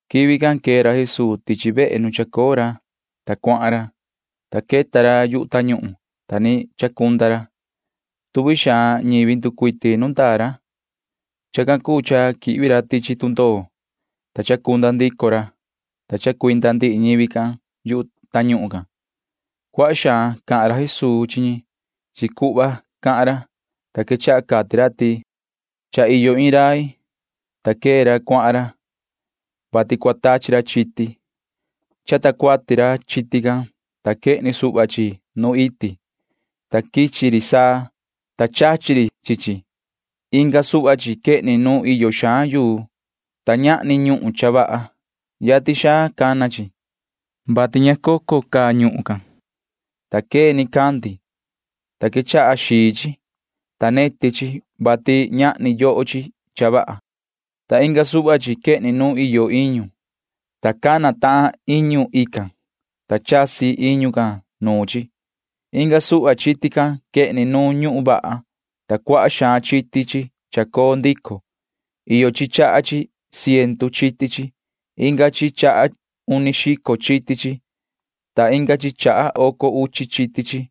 Quivi can quee ra Jesuu tichi vehe nu chacoo ra, ta cuahan ra. Yu tañuhun queta ra, ta ni chacunda ra. Tuvi xaan ñivi cuu ñi nducuiti nu ndaa ra. Chacan cuu cha quihvi ra tichi tundoo, ta chacunda ndico ra, ta chacuinda ndihi ñivi can yu tañuhun can. Cuaha xaan cahan ra Jesuu chi ñi. Chi cuhva cahan ra, ta quechaha cati ra ti: ―Cha iyo iin rai, ta quee ra cuahan ra, vati cua cata cuati ra chiti. Chata cuati ra chiti can, ta quehni suhva chi nu iti, ta quichi ri saa, ta chachi ri chi chi. Inga suhva chi quehni nu iyo xaan yuu, ta ñahni ñuhun cha vaha. Yatin xaan cana chi, vati ña cocon vaha iyo ñuhun can, ta cana nicandi, ta quechaha xii chi, ta neti chi, vati ñahni yoho chi cha vaha. Ta inga suhva chi quehni nu iyo iñu, ta cana tahan maan iñu can, ta chasi iñu can nuun chi. Inga suhva chiti can quehni nu ñuhun vaha, ta cuaha xaan chiti chi chacoo ndico. Iyo chi chaha iin ciendu chiti chi. Iyo inga chi chaha uni xico chiti chi, ta iyo inga chi chaha oco uchi chiti chi.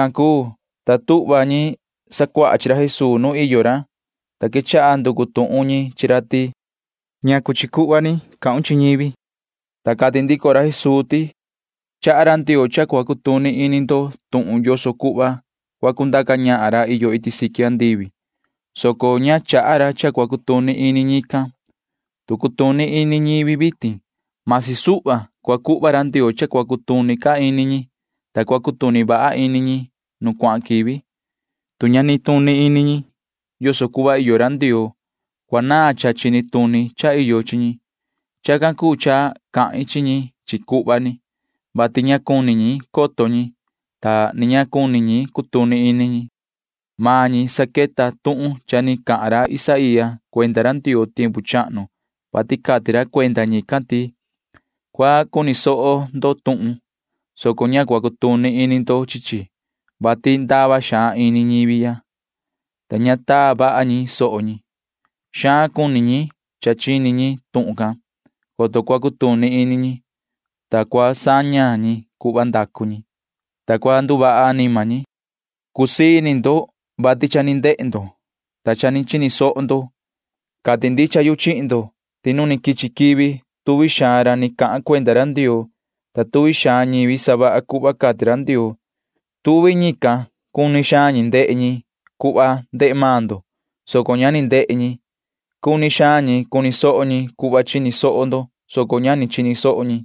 Tacan cuu, ta tuhva ñi sacuaha chi ra Jesuu nu iyo ra, ta quechaha nducu tuhun ñi chi ra ti: ―¿Ñacu chi cuhva ni cahun chi ñivi? ―cati ñi. Ta cati ndico ra ti: ―Chaha ra Ndioo cha cua cutuni ini ndo tuhun yoso cuhva cua cundaca ñahan ra iyo iti siqui andivi, soco ña chaha ra cha cua cutuni ini ñican. Tu cutuni ini ñivi vitin―masi suhva, cua cuhva ra Ndioo cha cua cutuni ca ini ñi, ta cua cutuni vaha ini ñi nu cuahan quivi. Tu ña nituni ini ñi [yoso cuhva iyo ra Ndioo], cua naan cha chini tuni cha iyo chi ñi. Chacan cuu cha cahin chi ñi chi cuhva, vati ña cuni ñi coto ñi, ta ni ña cuni ñi cutuni ini ñi. Maan ñi saqueta tuhun cha ni cahan ra Isaía cuenda ra Ndioo tiempu chahnu, vati cati ra cuenda ñican ti: Cua cuni soho ndo tuhun, soco ña cua cutuni ini ndo chi chi, vati ndava xaan iyo ini ñivi ya, ta ña taa vaha ñi soho ñi. Xaan cuni ñi chini ñi tuhun can, coto cua cutuni ini ñi, ta cua saña ñi cuhva ndacu ñi, ta cua nduvaha anima ñi, cati ra Isaía can. ’Cusii ini ndo, vati cha ni ndehe ndo, ta cha ni chini soho ndo. Cati ndicha yu chihin ndo ti nu ni quichi quivi tuvi xaan ra ni cahan cuenda ra Ndioo, ta tuvi xaan ñivi savaha cuhva cati ra Ndioo―tuvi ñican cuni xaan ñi ndehe ñi cuhva ndehe maan ndo, soco ña ni ndehe ñi. Cuni xaan ñi cuni soho ñi cuhva chini soho ndo, soco ña ni chini soho ñi.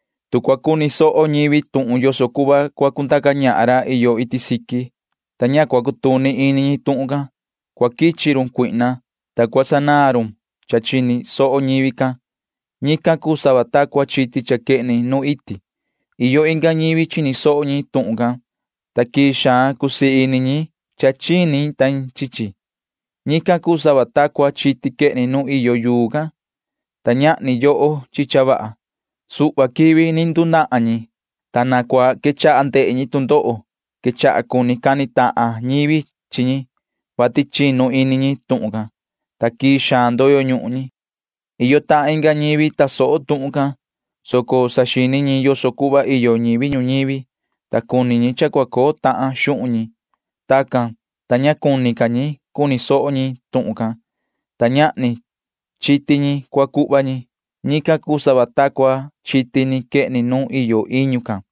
Tu cua cuni soho ñivi tuhun yoso cuhva cua cundaca ñahan ra iyo iti siqui, ta ña cua cutuni ini ñi tuhun can, cua quichi run cuihna, ta cua sanaan run cha chini soho ñivi can. Ñican cuu sava ta cua chiti can cha quehni nu iti. Iyo inga ñivi chini soho tuhun can, ta quii xaan cusii ini ñi chini ñi chi chi. Ñican cuu sava ta cua chiti quehni nu iyo yuu can, ta ñahni yoho chi cha vaha. Suhva quivi ni ndunahan ñi, ta quechaha ndehe ñi tu ndoho. Quechaha cuni cani tahan ñivi chi ñi, vati chinu ini ñi tuhun can, ta quii xaan ndoyo ñuhun ñi. Iyo tahan inga ñivi tasoho tuhun can, soco saxini ñi yoso cuhva iyo ñivi ñuñivi, ta cuni ñi cha cua coo tahan xuhun ñi. Tacan, ta ña cuni ca ñi cuni soho ñi tuhun can, ta ñahni cha cuu sava ta cua chiti can cua coo chi ñi. Ñican cuu sava ta cua chiti ni quehni nu iyo iñu can.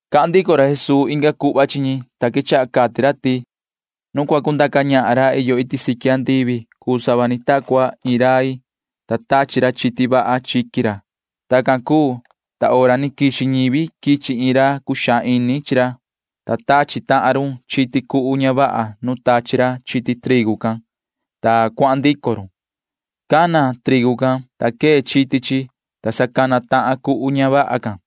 Cahan ndico ra Jesuu inga cuhva chi ñi, ta quechaha cati ra ti: ―Nu cua cundaca ñahan ra iyo iti siqui andivi cuu sava ni ta cua iin rai, ta tachi ra chiti vaha chiqui ra. Tacan cuu, ta hora ni quixi ñivi quichi iin ra cuxaan ini chi ra, ta tachi tahan run chiti cuhu ña vaha nu tachi ra chiti trigu can, ta cuahan ndico run. Cana itu can, ta quee chiti chi, ta sa cana tahan maan cuhu ña vaha can.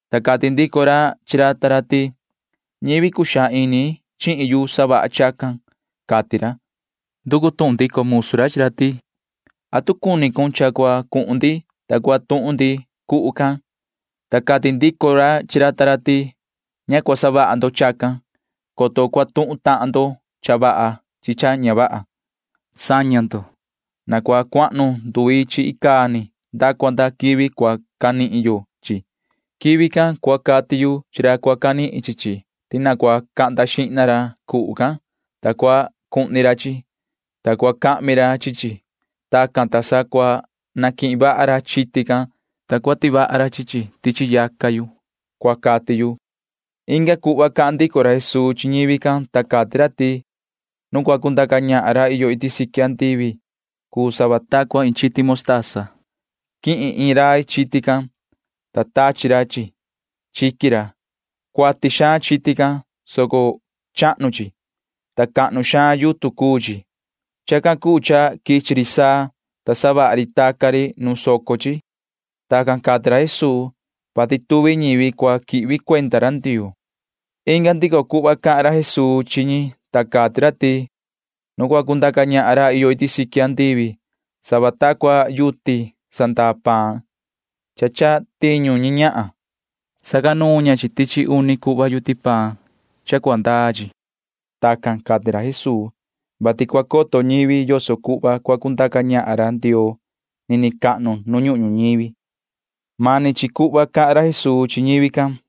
ta cati ndico ra chi ra ta ra ti: “Cuxaan ini ñivi chihin yu, ta savaha ñi chacan,” cati ra. Nducu tuhun ndico musu ra chi ra ti: “¿Atu cuni cun cha cua cuhun ndi, ta cua tuhun ndi cuhu can?” Ta cati ndico ra chi ra ta ra ti: “Ña cua savaha ndo chacan, coto cua tuhun tahan ndo cha vaha chi cha ña vaha. Saña ndo. Na cua cuahnu nduvi chi icaa ni nda cua nda quivi cua canihin yo chi chi. Quivi can cua cati yu chi ra cua canihin chi chi ti cahnda xihna ra cuhu can, ta cuhni ra chi chi, ta cahmi ra chi chi. Tacan, ta sa cua canihin vaha ra chiti can, ta cua tivaha ra chi chi tichi yaca yu,” cua cati yu, cati ra ―cati ra Jesuu chi ñi. Inga cuhva cahan ndico ra Jesuu chi ñivi can. Cati ra ti: ―Nu cua cundaca ñahan ra iyo iti siqui andivi cuu sava ni ta cua iin chiti motasa. Quihin iin rai chiti can, ta tachi ra chi chi chiqui ra. Cuati xaan chiti can, soco chahnu chi, ta cahnu xaan yutun cuu chi. Chacan cuu cha quichi ri saa, ta savaha ri taca ri soco chi. Tacan cati ra Jesuu, [vati cua ndutuvi ñivi quihvi cuenda ra Ndioo]. Inga ndico cuhva cahan ra Jesuu chi ñican. Cati ra ti: ―Nu cua cundaca ñahan ra iyo iti siqui andivi cuu sava ta cua iin nduta cha sanandaa yuti paan cha quihin iin ñahan. Tihi ña chi chi tichi uni cuhva yuti paan, ta chinu xico chi niniin yuti paan can. Tacan cati ra Jesuu, [vati cua coto ñivi yoso cuhva cua cundaca ñahan ra Ndioo nini cahnu nu ñuhun ñuñivi]. Ndihi cuhva can cahan ra Jesuu chi ñivi can.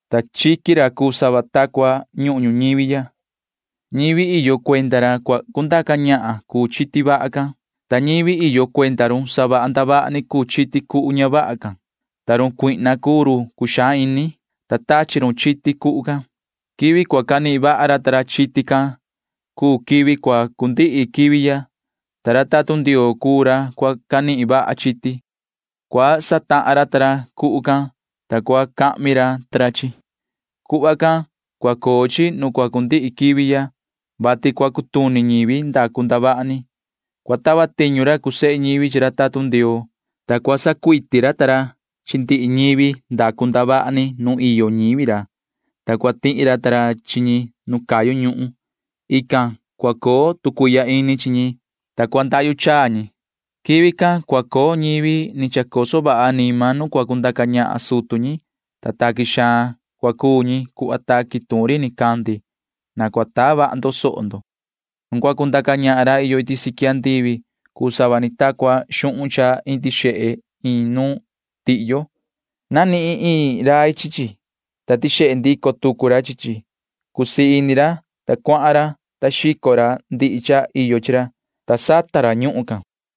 ta chiqui ra cuu sava ta cua ñuhun ñuñivi ya. Ñivi iyo cuenda ra cua cundaca ñahan cuu chiti vaha can, ta ñivi iyo cuenda run savaha ndavaha ni cuu chiti cuhu ña vaha can, ta run cuihna cuu run cuxaan ini, ta tachi run chiti cuhu can. Quivi cua canihin vaha ra ta ra chiti can cuu quivi cua cundihi quivi ya, ta ra tatun Ndioo cuu ra cua canihin vaha chiti. Cuhva satahan ra ta ra cuhu can, ta chahmi ra ta ra chi chi―cuhva can cua coo chi nu cua cundihi quivi ya, [vati cua cutuni ñivi ndacu ndavaha ni]. Cua tava tiñu ra cuu sehe ñivi chi ra tatun Ndioo, ta cua sacuiti ra ta ra chi ndihi ñivi ndacu ndavaha ni nu iyo ñivi ra, ta cua tihi ra ta ra chi ñi nu cayu ñuhun. Ican cua coo tu cuihya ini chi ñi, ta cua ndahyu chaa ñi. Quivi can cua coo ñivi ni chacoso vaha anima nu cua cundaca ñahan sutu ñi, ta taqui xaan cua cuu ñi cuhva taqui tuun ri nicandi. Na cua taa vaha ndo soho ndo. [Ni vii cahan ra Jesuu chi ra sacuaha chi ra ti:] ’Nu cua cundaca ñahan ra iyo iti siqui andivi cuu sava ni ta cua xuhun cha indi xehe chiqui. Nanihin iin rai chi chi, ta tixehe ndico tucu ra chi chi. Cusii ini ra, ta cuahan ra, ta xico ra ndihi cha iyo chi ra, ta sata ra ñuhun can.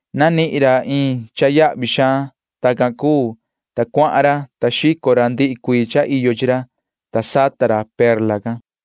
Nanihin ra iin cha yahvi xaan. Tacan cuu, ta cuahan ra, ta xico ra ndihi cuii cha iyo chi ra, ta sata ra perla can.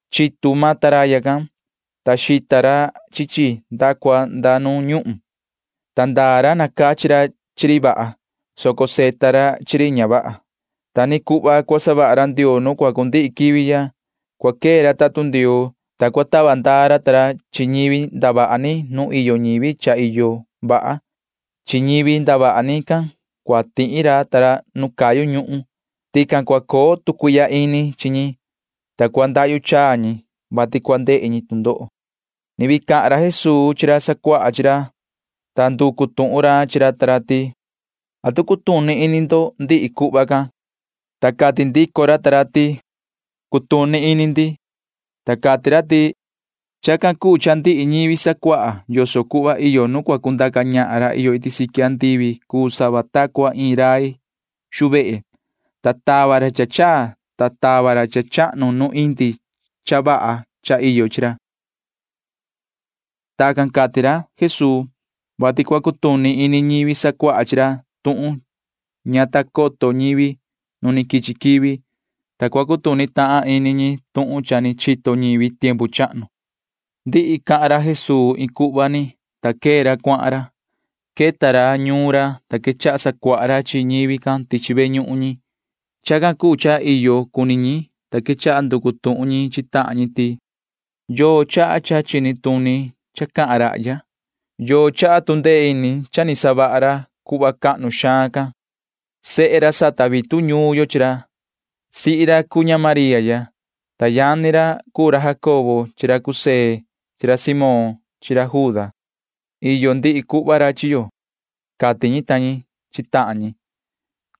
Chitu maan taraya can, ta xita ra chi chi nda cua nda nu ñuhun, ta ndaa ra nacachi ra chi ri vaha, soco savita ra chi ri ña vaha. Ta ni cuhva cua savaha ra Ndioo nu cua cundihi quivi ya. Cua quee ra tatun Ndioo, ta cua sachiyo ra ta ra chi ñivi ndavaha ni nu iyo ñivi cha iyo vaha. Chi ñivi ndavaha ni can cua tihi ra ta ra nu cayu ñuhun. Tican cua coo tu cuihya ini chi ñi, ta cua ndahyu chaa ñi, vati cua ndehe ñi tu ndoho. [Ni vii cahan ra Jesuu chi ra sacuaha chi ra,] ta nducu tuhun ra chi ra ta ra ti: ―¿Atu cutuni ini ndo ndihi cuhva can? Ta cati ndico ra ta ra ti: ―Cutuni ini ndi. Ta cati ra ti: ―Chacan cuu cha ndihi ñivi sacuaha yoso cuhva iyo nu cua cundaca ñahan ra iyo iti siqui andivi cuu sava ta cua iin rai xu vehe, ta tava ra cha chaa, ta tava ra cha chahnu nu indi cha vaha cha iyo chi ra. Tacan cati ra Jesuu, [vati cua cutuni ini ñivi sacuaha chi ra tuhun ña ta coto ñivi nu ni quichi quivi, ta cua cutuni tahan ini ñi tuhun cha ni chito ñivi tiempu chahnu]. Cha ndihi cahan ra Jesuu cuhva can, ta quee ra cuahan ra. Queta ra ñuun ra, ta quechaha sacuaha ra chi ñivi can tichi ve ñuhun ñi. Chacan cuu cha iyo cuni ñi, ta quechaha nducu tuhun ñi chi tahan ñi ti: ―¿Yoo chaha cha chini tuni cha cahan rahya? ¿Yoo chaha tu ndee ini cha ni savaha ra cuhva cahnu xaan can? Sehe ra sata vitu ñuun yo chi ra. Sihi ra cuu ña María ya, ta yani ra cuu ra Jacobo chi ra José chi ra Simón chi ra Juda. Iyo ndihi cuhva ra chi yo ―cati ñi ta ñi chi tahan ñi,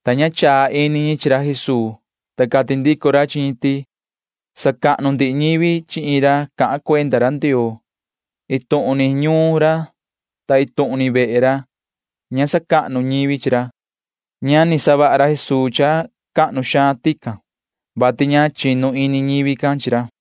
ta ña chaa ini ñi chi ra Jesuu. Ta cati ndico ra chi ñi ti: ―Sacahnu ndihi ñivi chi iin ra cahan cuenda ra Ndioo. Iin tuhun ni ñuun ra ta iin tuhun ni vehe ra ña sacahnu ñivi chi ra ―cati ra. Ña ni savaha ra Jesuu cha cahnu xaan tican, vati ña chinu ini ñivi can chi ra.